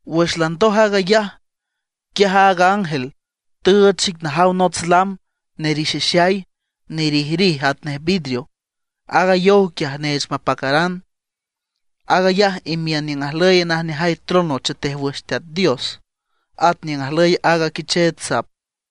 Wüx landoj aag ayaj, quiaj aaga ángel tüüch xic najaw nots lam nerixixay, nerijrij atnej vidrio; aaga yow quiaj neech mapacaran. Aag ayaj imiün niüng ajlüy najneajay trono chetej wüx Teat Dios, at niüng ajlüy aaga Quicheech Sap.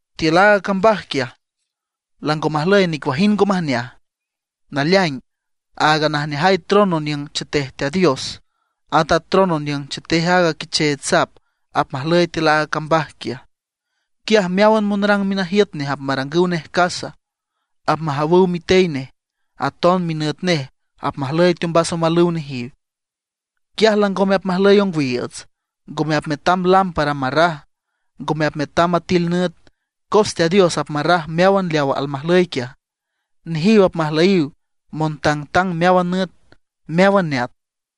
Tiül aaga cambaj quiaj lango majlüy nicuajind ngo majneaj. Naleaing aaga najneajay trono niüng chetej Teat Dios, at a trono niüng chetej aaga Quicheech Sap apmajlüy tiül aaga cambaj quiaj. Quiaj meáwan monrang minajiüt nej apmarangüw nej casa. Apmajawüw mitey nej, aton minüt nej apmajlüy teombas omalüw nejiw. Quiaj langome apmajlüy ongwiiüts, ngome apmetam lámpara marraj; ngome apmetam atil nüt, cos Teat Dios apmarraj meáwan leaw almajlüy quiaj. Nejiw apmajlüyiw montangtang meáwan nüt, meáwan neat.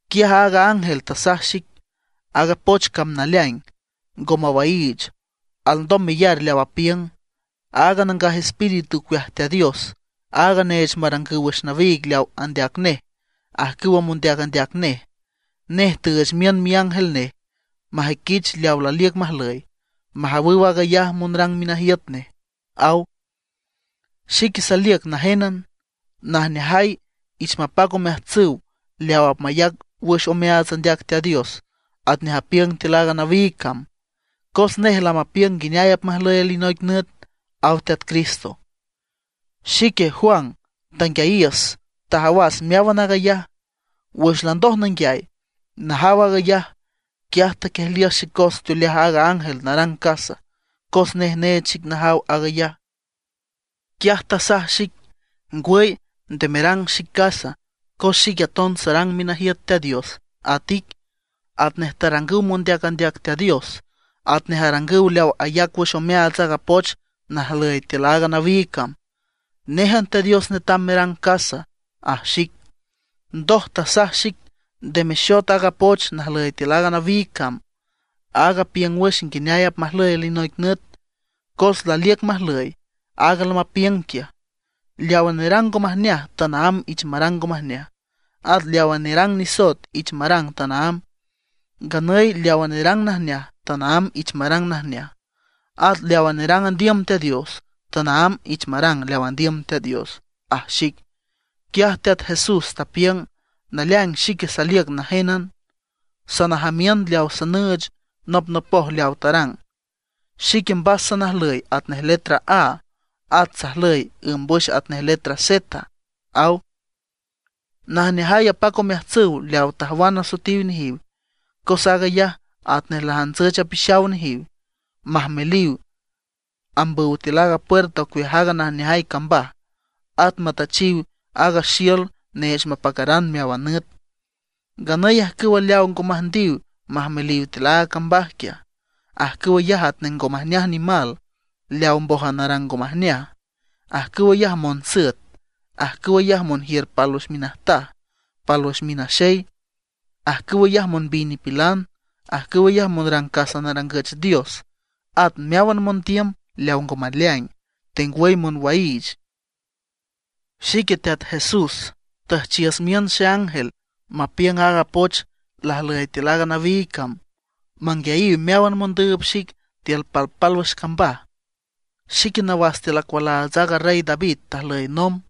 Quiaj aaga ángel tasaj xic: ―Aaga poch cam naleaing, ngo mawaiich, alndom meyar leaw apiüng. Aaga Nangaj Espíritu ocueaj Teat Dios, aag neech marangüw wüx nawiig leaw andeac nej ajcüw mondeac andeac nej, nej tüüch miün miángel nej majüiquich leawa laliüc majlüy, majawüw aag ayaj monrang minajiüt nej ―aw. ―¡Xique saliüc najénan! ¡Najneajay, ich mapac omeajtsüw leawa apmayac wüx omeaats andeac Teat Dios atnej apiüng tiül aaga nawiig cam, cos nej lamapiüng nguineay apmajlüy alinoic nüt! ―aw Teat Cristo. Xique, Juan, tanguiayiüs, tajawas meáwan aag ayaj. Wüx landoj nanguiay, najaw aag ayaj, quiaj taquiejliüs xecos teoleaj aaga ángel narang casa, cos nej neech xic najaw aag ayaj. Quiaj tasaj xic: ―Ngwüy, nde merang xic casa, cos xique aton sarang minajiüt Teat Dios at ic, atnej tarangüw mondeac andeac Teat Dios, atnej arangüw leawa ayac wüx omeaats aaga poch najlüy tiül aaga nawiig cam. Néjan Teat Dios netam merang casa ―aj xic. Ndoj tasaj xic: ―Nde mexot aaga poch najlüy tiül aaga nawiig cam, aag apiüng wüx nguineay apmajlüy alinoic nüt, cos laliüc majlüy aaga lamapiüng quiaj. Leawa nerang ngo majneaj, tanaámb ich marang ngo majneaj, at leawa nerang nisoet ich marang tanaámb. Nganüy leawa nerang najneaj, tanaámb ich marang najneaj. At leawa nerang andiüm Teat Dios, tanaámb ich marang leaw andiüm Teat Dios ―aj xic. Quiaj Teat Jesús tapiüng: ―Naleaing xique saliüc najénan, sanajamiün leaw sanüüch nopnopoj leaw tarang. Xique mbas salnajlüy atnej letra A, at sajlüy ǘmbwüx atnej letra Z ―aw. Najneajay apac omeajtsüw leawa tajwan asoetiw nejiw, cos aag ayaj atnej lajantsüch apixaw nejiw, majmeliw ambüw tiül aaga puerta ocueaj aaga najneajay cambaj, at matüchiw aaga xiül neech mapacaran meáwan nüt. Nganüy ajcüwa leawa ngo müjndiw majmeliw tiül aaga cambaj quiaj, ajcüw ayaj atnej ngo majneaj nimal leaw mbójan arang ngo majneaj. Ajcüw ayaj monsüet; ajcüw ayaj monjiür pálwüx minajtaj pálwüx minaxey; ajcüw ayaj monbiy nipilan; ajcüw ayaj monrang casa narangüch dios; at meáwan mondiüm leaw ngo maleaing, tengwüy monwaiich. ―Xique Teat Jesús tüjchiüs miün xeángel mapiüng aaga poch lajlüy tiül aaga nawiig cam, manguiayiw meáwan mondüüb xic tiül palpálwüx cambaj. Xique nawas tiül acualaats aaga Rey David tajlüy nomb.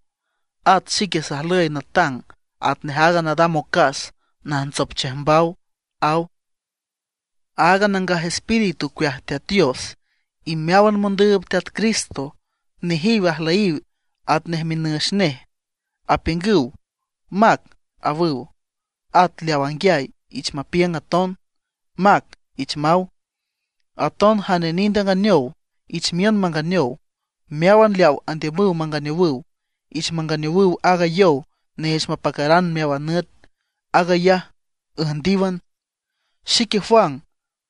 At xique sajlüy natang atnej aaga nadam ocas najntsop chiüjmbaw ―aw. Aaga Nangaj Espíritu ocueaj Teat Dios, y meáwan mondüüb Teat Cristo, nejiw ajlüyiw atnej minüx nej, apiüngüw: ―Mac ―awüw. At leaw anguiay, ich mapiüng aton: ―Mac ―ich maw. Aton jane nind anganeow, ich miün manganeow; meáwan leawa andiümüw manganeowüw, ich manganeowüw aaga yow neech mapacaran meáwan nüt, aag ayaj üjndíwan. Xique Juan,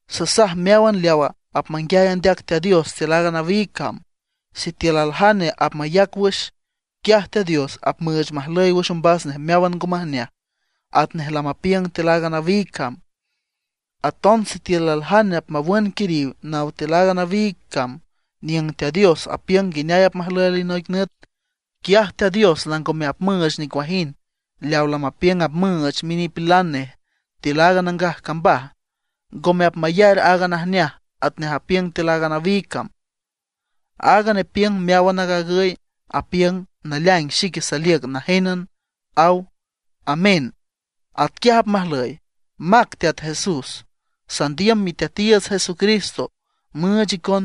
sasaj meáwan leawa apmanguiay andeac Teat Dios tiül aaga nawiig cam: Sitiül aljane apmayac wüx, quiaj Teat Dios apmüüch majlüy wüx ombas nej meáwan ngo majneaj atnej lamapiüng tiül aaga nawiig cam. Aton sitiül aljane apmawün quiriw naw tiül aaga nawiig cam niüng Teat Dios apiüng nguineay apmajlüy alinoic nüt, quiaj Teat Dios langome apmüüch nicuajind leaw lamapiüng apmüüch minipilan nej tiül aaga nangaj cambaj; ngome apmayar aaga najneaj atnej apiüng tiül aaga nawiig cam. Aaga nepiüng meáwan aag agüy, apiüng: ―Naleaing xique saliüc najénan ―aw. Amén. ¡Atquiaj apmajlüy! ¡Mac Teat Jesús! Sandiüm Miteatiiüts Jesucristo müüch icon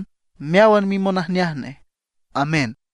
meáwan mimonajneaj nej. Amén.